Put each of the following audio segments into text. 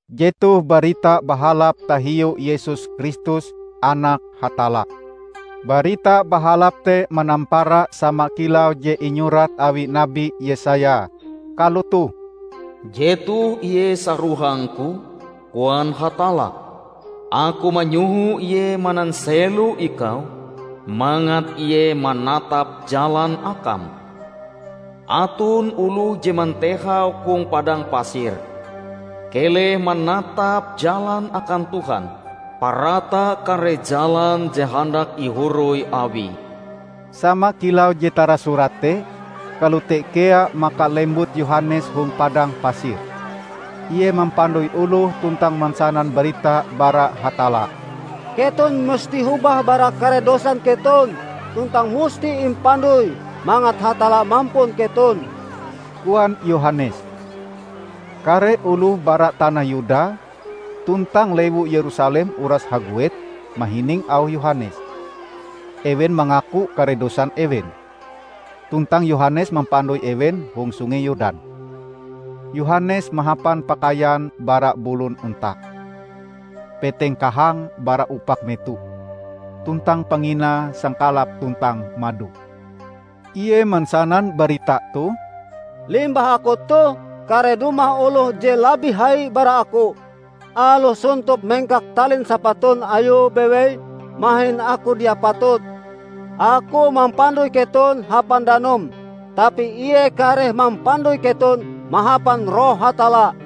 Jetoh Barita Bahalap tahiu Yesus Kristus, Anak Hatalla. Barita Bahalap te manampara sama kilau je inyurat awi Nabi Yesaya, kalotoh, " 'Jetoh Ie sarohangku,' koan Hatalla; 'Aku manyoho ie mananselo Ikau, mangat ie manatap jalan Akam.' Aton oloh je mantehau hong padang pasir, 'Keleh manatap jalan akan Tuhan; parata kare jalan je handak ihoroi Awie.' " Sama kilau je tarasurat te, kalote kea maka lembut Yohanes hong padang pasir. Ie mampandoi oloh tuntang mansanan barita bara Hatalla. "Keton musti hobah bara kare dosan keton tuntang musti impandoi mangat Hatalla mampun keton," koan Yohanes. Kare oloh bara tanah Yuda tuntang lewu Yerusalem uras haguet mahining auh Yohanes. Ewen mangaku kare dosan ewen, tuntang Yohanes mampandoi ewen hong Sungei Yordan. Yohanes mahapan pakaian bara bulon onta. Peteng kahange bara upak meto, tuntang panginae sangkalap tuntang mado. Ie mansanan barita toh, "Limbah aku toh, kareh dumah oloh je labih hai bara aku. Aloh sontop mengkak talin sapatun Ayue bewei, mahin aku dia patut. Aku mampandoi keton hapan danum, tapi Ie kareh mampandoi keton mahapan Roh Hatalla."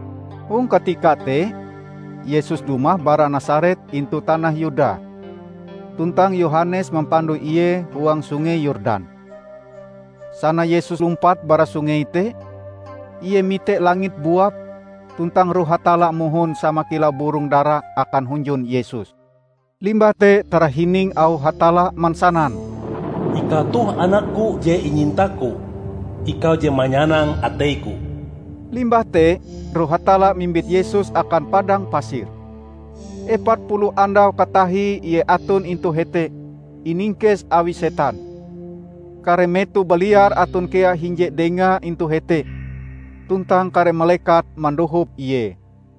Hong katika te Yesus dumah bara Nasaret intu tanah Yuda, tuntang Yohanes mampandoi Ie huang Sungei Yordan. Sana Yesus lumpat bara sungei te, Ie mite langit buap tuntang Roh Hatalla mohon sama kilau burong dara akan hunjun Yesus. Limbah te tarahining auh Hatalla mansanan, "Ikau toh anak-Ku je inyinta-Ku. Ikau je manyanang atei-Ku." Limbah te Roh Hatalla mimbit Yesus akan padang pasir. Epat puluh andau katahie Ie aton intu hete, iningkes awi setan. Kare meto baliar aton kea hinje Dengae intu hete, tuntang kare malekat mandohop Ie.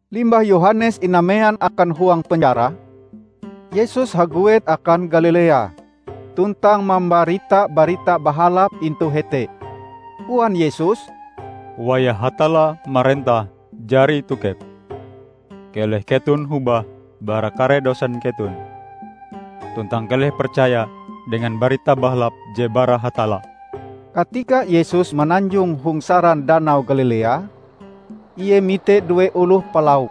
Limbah Yohanes inamean akan huang penjara, Yesus haguet akan Galilea, tuntang mambarita Barita Bahalap intu hete. Koan Yesus, "Wayah Hatalla marentah jari tokep. Keleh keton hobah bara kare dosan keton, tuntang keleh percaya dengan Barita Bahalap je bara Hatalla!" Katika Yesus mananjong hong saran Danau Galilea, Ie mite due oloh palauk,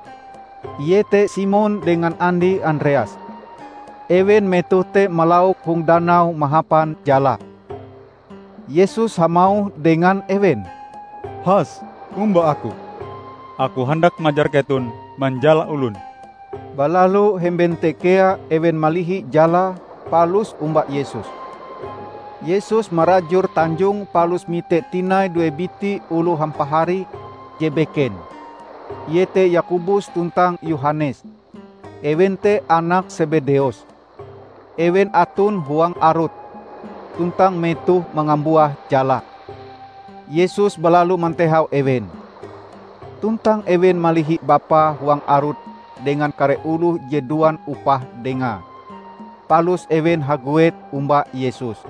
iete Simon dengan andie Andreas. Ewen metoh te malauk hong danau mahapan jala. Yesus hamauh dengan ewen, "Has omba Aku. Aku handak majar keton manjala olon." Balalu hemben te kea ewen malihi jalae palus omba Yesus. Yesus marajur tanjonge palus mite tinai due biti oloh hampahari je beken, iete Yakobus tuntang Yohanes, ewen te anak Sebedeus. Ewen aton huang arut, tuntang metohe mangambuah jalae. Yesus balalu mantehau ewen. Tuntang ewen malihi bapae huang arut dengan kare oloh je duan upah dengae. Palus ewen haguet omba Yesus.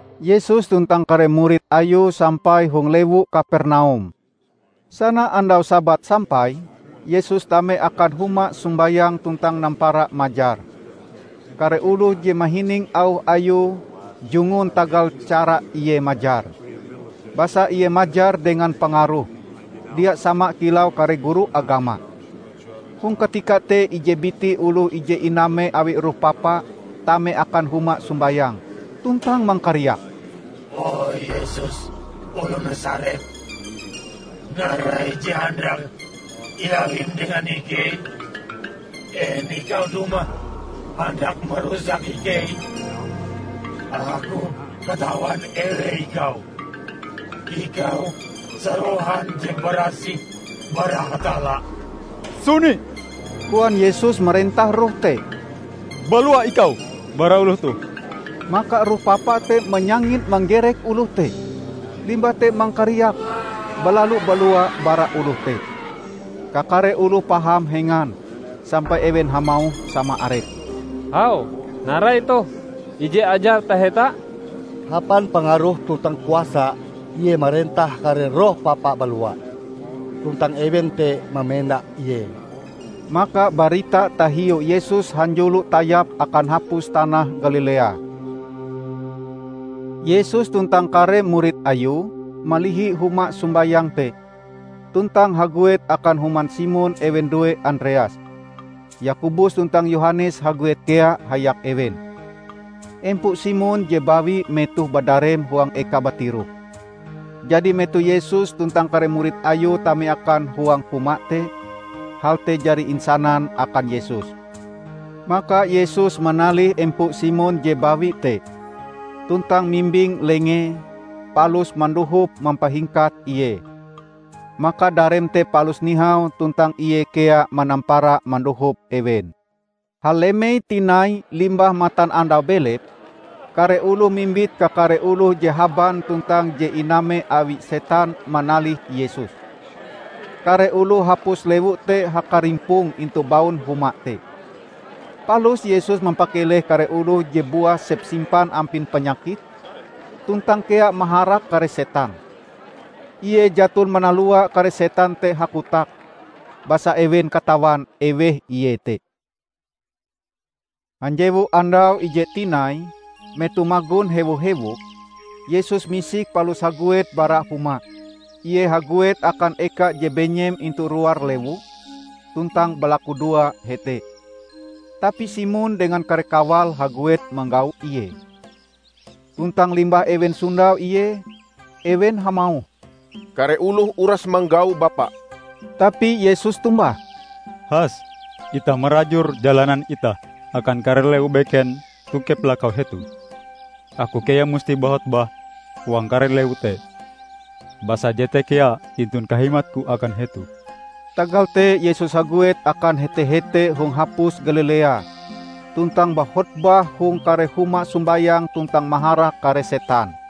Yesus tuntang kare murid Ayue sampai hong lewu Kapernaum. Sana andau Sabat sampai, Yesus tame akan huma sombayang tuntang nampara majar. Kare oloh je mahining auh Ayue jungun tagal cara Ie majar. Basa Ie majar dengan pangaroh, dia sama kilau kare guru agama. Hong katika te ije biti oloh je iname awi roh papa tame akan huma sombayang, tuntang mangkariak, "O Yesus, oloh Nasaret, narai je handak iawim dengan ikei? En ikau dumah handak marusak ikei? Aku katawan eweh ikau: ikau, Sarohan je barasih bara Hatalla!" "Suni!" koan Yesus marentah roh te, "Balua ikau bara oloh toh!" Maka roh papa te manyangit manggerek oloh te, limbah te mangkariak, balalu balua bara oloh te. Kakare oloh paham hengan, sampai ewen hamauh sama arepe, "Hau, narai toh? Ije ajar taheta! Hapan pangaroh tuntang kuasa Ie marentah kare roh papa balua, tuntang ewen te mamenda Ie!" Maka barita tahiu Yesus hanjulo tayap akan hapus tanah Galilea. Yesus tuntang kare murid Ayue malihi huma sombayang te, tuntang haguet akan human Simon ewen due Andreas. Yakobus tuntang Yohanes haguet kea hayak ewen. Empo Simon je bawi metohe badarem huang ekae batiroh. Jadi metoh Yesus tuntang kare murid Ayue tame akan huang huma te, hal te jari insanan akan Yesus. Maka Yesus manalih empo Simon je bawi te, tuntang mimbing lengee, palus mandohop mampahingkat ie. Maka dareme te palus nihau tuntang ie kea manampara mandohop ewen. Halemei tinai limbah matanandau belep, kare oloh mimbit kakare oloh je haban tuntang je iname awi setan manalih Yesus. Kare oloh hapus lewu te hakarimpong intu baun huma te. Palus Yesus mampakeleh kare oloh je buah sepsimpan ampin panyakit, tuntang kea maharak kare setan. Ie jaton manalua kare setan te hakotak, basa ewen katawan eweh Ie te. Hanjewu andau ijee tinai, metoh magon hewo-hewok, Yesus misik palus haguet bara huma. Ie haguet akan eka je benyem intu luar lewu, tuntang balakudoa hete. Tapi Simon dengan kare kawale haguet manggau Ie. Tuntang limbah ewen sondau Ie, ewen hamauh, "Kare oloh uras manggau Bapa." Tapi Yesus tombah, "Has itah marajur jalanan itah akan kare lewu beken tokep lakau hetoh. Aku kea musti bahotbah huang kare lewu te, basa jete kea tintun kahimatku akan hetoh." Tagal te Yesus haguet akan hete-hete hong hapus Galilea, tuntang bahotbah hong kare huma sombayang tuntang maharak kare setan.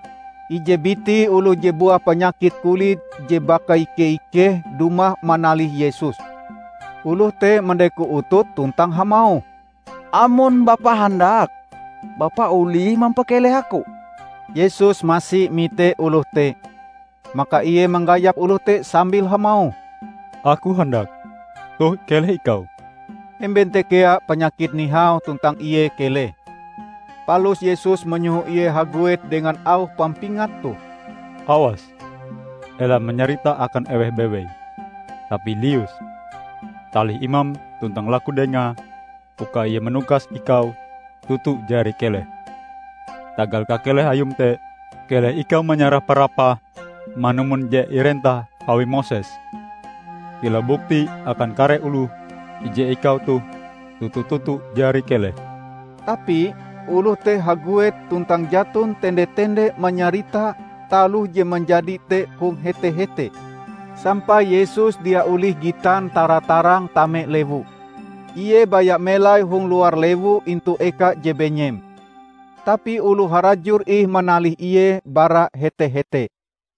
Ije biti oloh je buah panyakit kulit je bakaike-ikeh dumah manalih Yesus. Oloh te mandeko utute tuntang hamauh, "Amon Bapa handak, Bapa olih mampakeleh aku." Yesus masi mite oloh te. Maka Ie manggayap oloh te sambil hamauh, "Aku handak, toh keleh ikau!" Hemben te kea panyakite nihau tuntang ie keleh. Palus Yesus manyoho ie haguet dengan auh pampingat toh: "Awas, ela manyarita akan eweh bewei, tapi lius, talih imam tuntang laku dengae uka ie manukas ikau toto jari keleh. Tagal kakeleh ayum te, keleh ikau manyarah parapahm manumon je irentah awi Moses, kilau bukti akan kare oloh ije ikau toh toto-toto jari keleh." Tapi oloh te haguet tuntang jaton tende-tende manyarita taloh je manjadi te hong hete-hete sampai Yesus dia olih gitan tara-tarang tame lewu. Ie baya melai hong luar lewu intu eka je benyem. Tapi oloh harajur ih manalih Ie bara hete-hete.